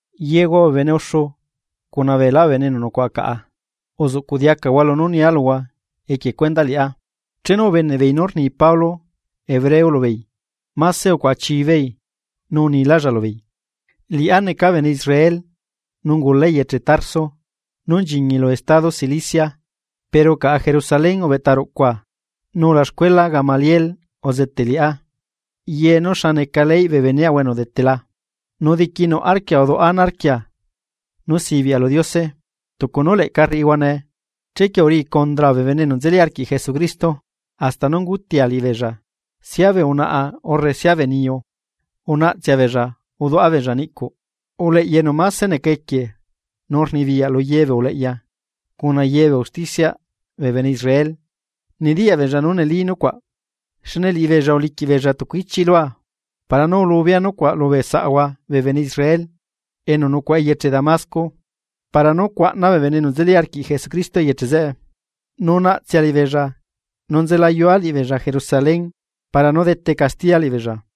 ―Yehua bee bene uxu cuna beelá bee bene enu nucuaꞌa caꞌa, uzuꞌcuꞌ diacahua lunú nia luhua equie cuendaꞌ liꞌá. Chenu ubeneꞌbeei nú rni Pablo hebreo lubeei, máse ucuaꞌa chibeei, nu unilálla lubeei: ―Liꞌá neca bene Israel, nu ungula eyeche Tarso nú nchiñi lu estado Cilicia, pero caꞌa Jerusalén ubeꞌta ruꞌcua nu ulaxcuela Gamaliel uzeteꞌ liꞌá ye nú xa neca leyꞌ bee beneaꞌahua enu udetela, nu diquinuꞌ arquia uduꞌa ana arquia nú sibiaꞌa lu Diose tucu nú leꞌca rriꞌihua nee. Chequie uriꞌi condraa bee bene enu nzeli arquiꞌ Jesucristo, hasta nú ungutia liꞌibeella, sia bee unaꞌa urre sia bee niyu unaꞌtsea beella uduꞌa beella niꞌcuꞌ. Uleꞌya enu máse neca equie nu rnibiyaꞌ lu ye bee uleꞌya cuna ye bee usticiaꞌ bee bene Israel nediyaꞌ beella nú neli nucuaꞌ. Xne liꞌibeella uliquiꞌ beella tucu ichiꞌ lua para nú ulubea nucuaꞌ lubee saꞌahua bee bene Israel enu nucuaꞌa eyeche Damasco para nú cuaꞌna bee bene enu nzeli arquiꞌ Jesucristo eyeche zeꞌe, nu naꞌtsea liꞌibeella nu nzelayua liꞌibeella Jerusalén para nú dete castiya liꞌibeella.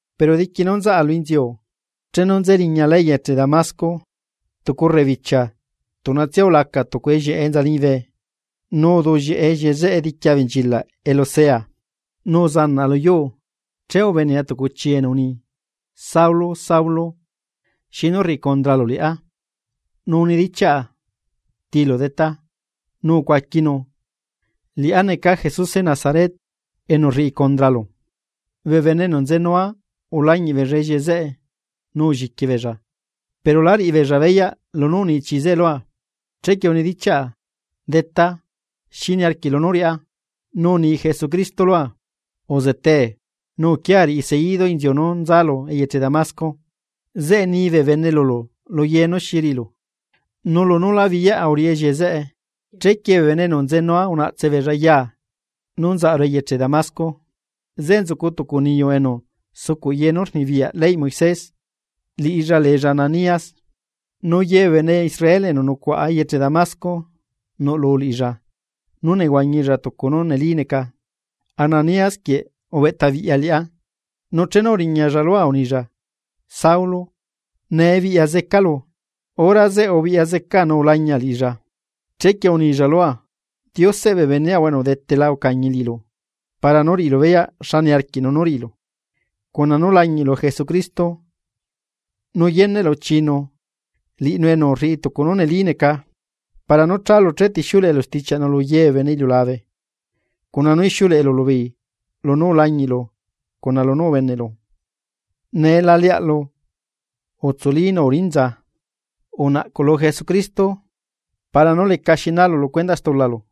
’Pero diqui nú nzaꞌa lu inziu, chenu nze riñala eyeche Damasco, tucu rrebibichia tuꞌnatsia ulaca tucu ellieꞌe enza liñibe nu uduꞌllieꞌe ellieꞌe zeꞌe diqui abenchilaꞌ elu sea, nu uzanaꞌa luyuu. Che ubenea tucu chii enu uni: “Saulo, Saulo, ¿xinu rriꞌi condralu liꞌá?” Nu unidichiaꞌa: ¿Tilu Detá? “Nu ucuaquinu: Liꞌá neca Jesuse Nazaret enu rriꞌi condralu.” Bee bene enu nzenua ulañiꞌ beella ellieꞌe zeꞌe nu ulliqui beella, pero la riꞌibeella beyaꞌ lunú uni chii zeꞌe lua. Chequie unidichiaꞌa: “Detá, ¿xi niarquiꞌlu nú riꞌá?” Nu uni Jesucristo lua: “Uzetee. Nu uquiaa riꞌi seidu inziu nú nzalu eyeche Damasco, zeꞌe nii bene lulu lu ye nú riꞌilu.” Nu lunú la biꞌyaꞌa uriꞌi ellieꞌe zeꞌe, chequie bee bene enu nzenua unaꞌtse beella yaa nu nzaꞌaru eyeche Damasco. ’Zeꞌe nzucu tucu niyu enu sucuꞌ ye nú rnibiyaꞌ leyꞌ Moisés liꞌilla leella Ananías, nu ye bee bene Israel enu nucuaꞌa eyeche Damasco nuꞌlu liꞌilla nú nehuañilla tucu nú neli neca. Ananías quieꞌ ubeꞌta biꞌya liꞌá, nu chenu uriñalla lua unilla: “Saulo, nee biꞌya zecalu. Hora zeꞌe ubiꞌya zecaa nu ulañia liꞌilla.” Chequie unilla lua: “Dioseꞌ bee beneꞌahua enu udetela ucañi liꞌilu para nú riꞌilu beyaꞌ xa niarquiꞌnu nú riꞌilu, cuna nú lañiꞌlu Jesucristo nu yeneꞌlu chiinu liꞌinu enu rriꞌi tucu nú neli neca. Para nú chálu chetixiuleꞌelu stichiaꞌnu lu ye bee bene iliulabe cuna nú ixiuleꞌelu lubeei lunú ulañiꞌlu cuna lunú ubeneꞌlu. Nee la leaꞌlu. Utsuli nu urinza, unaꞌcuꞌ lu Jesucristo para nú lecaxi naalu lu cuendaꞌ stulalu.”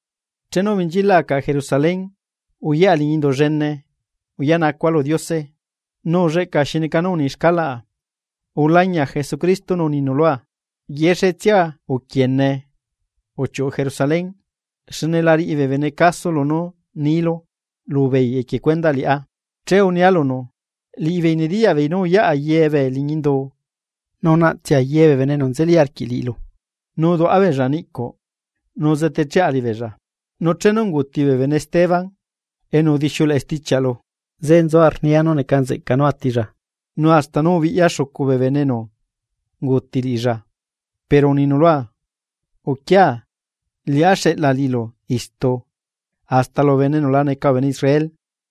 ’Chenu ubenchilaꞌa caꞌa Jerusalén uyaꞌa liñi Indu llene uyaꞌnacua lu Diose, nu ulleꞌca xi neca nú uni xcalaꞌa. Ulañia Jesucristo nu uninu lua: “Uquiene, yexetsia uchiuꞌu Jerusalén, xne la riꞌi bee bene caso lunú niilu lubeei equie cuendaꞌ liꞌá.” Che unia lunu: “Liꞌibeei nediyaꞌ beei nú uyaꞌa ye bee liñi indu nu unaꞌtsea ye bee bene enu nzeli arquiꞌ liꞌilu, nu uduaꞌa beella niꞌcuꞌ nu uzetecheꞌa liꞌibeella. Nu chenu unguuti bee bene Esteban enu udixiuleꞌe stichiaꞌlu, zeꞌe nzua rnia nú neca nzeꞌca nú atilla, nu hasta nú ubiꞌyaa xucu bee enu unguuti liꞌilla.” Pero uninu lua: “Uquia, liꞌá xeꞌla liꞌilu istu hasta lubee bene enu la neca bee bene Israel.”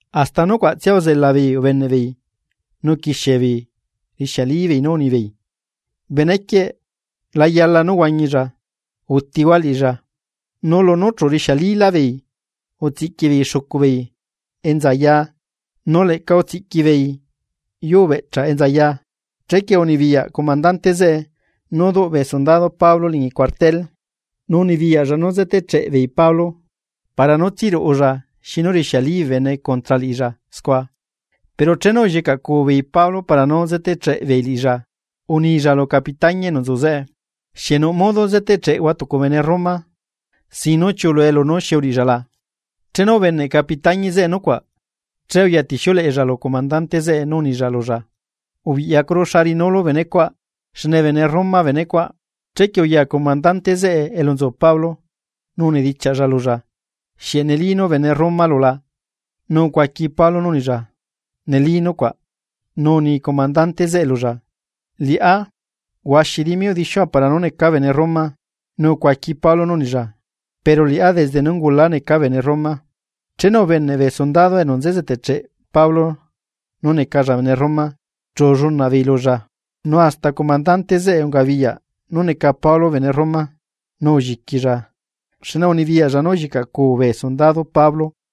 Hasta nucuaꞌtsia uzelabeei ubeneꞌbeei nu uquixiebeei rixialibeei nú unibeei: ―¡Benequieꞌ la yala nú huañilla! ¡Utihua liꞌilla! Nu lunú chu rixialilábeei utsiꞌqui beei xucu beei enza yaa, nu leꞌca utsiꞌqui beei yuu beꞌchaꞌ enza yaa, chequie unibiyaꞌ comandante zeꞌe nú duꞌ bee sundado Pablo liñi cuartel, nu unibiyaꞌlla nú zetecheꞌbeei Pablo para nú tsiruꞌulla xinu rixiali bee bene contra liꞌilla scua. Pero chenu ullicaꞌcuu beei Pablo para nú zeteꞌcheꞌbeei liꞌilla, unilla lu capitañi enu nzu zeꞌe: ―¿Xieꞌ nuꞌ modo zeteꞌcheꞌhua tucu bene Roma, sin nú chiuꞌulue lunú xi uriꞌilla la? Chenu ubeneꞌ capitañi zeꞌe nucuaꞌ, che uyatixiuleꞌella lu comandante zeꞌe nu unilla lulla: ―Ubiꞌyacuru xa riꞌinulu benecuaꞌ, xne bene Roma benecuaꞌ. Chequie uya comandante zeꞌe elu nzu Pablo, nu unidichiaꞌlla lulla: ―¿Xieꞌ neli nú bene Romalu? Nu ucuaqui Pablo nú unilla: ―Neli nucuaꞌ. Nu uni comandante zeꞌe lulla: ―Liꞌá huaxi dimi udixiua para nú neca bene Roma. Nu ucuaqui Pablo nú unilla: ―Pero liꞌá desde nú ungula neca bene Roma. Chenu ubeneꞌ bee sundado enu nze zetecheꞌ Pablo nú necalla bene Roma chu ullunaꞌbeei lulla. Nu hasta comandante zeꞌe ungabiyaꞌ nú neca Pablo bene Roma, nu ulliquilla xne unibiyaꞌlla nú ullicaꞌcuu bee sundado Pablo.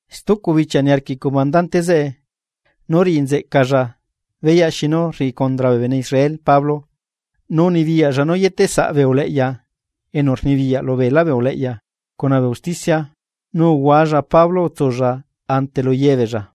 Stucu bichia niarquiꞌ comandante zeꞌe nú riꞌi nzeꞌcalla beyaꞌ xinu rriꞌi condra bee bene Israel Pablo. Nu unibiyaꞌlla nú yeteꞌsaꞌ bee uleꞌya enu rnibiyaꞌ lubee uleꞌya cuna bee usticia, nu uhualla Pablo utsulla ante lu yebeella.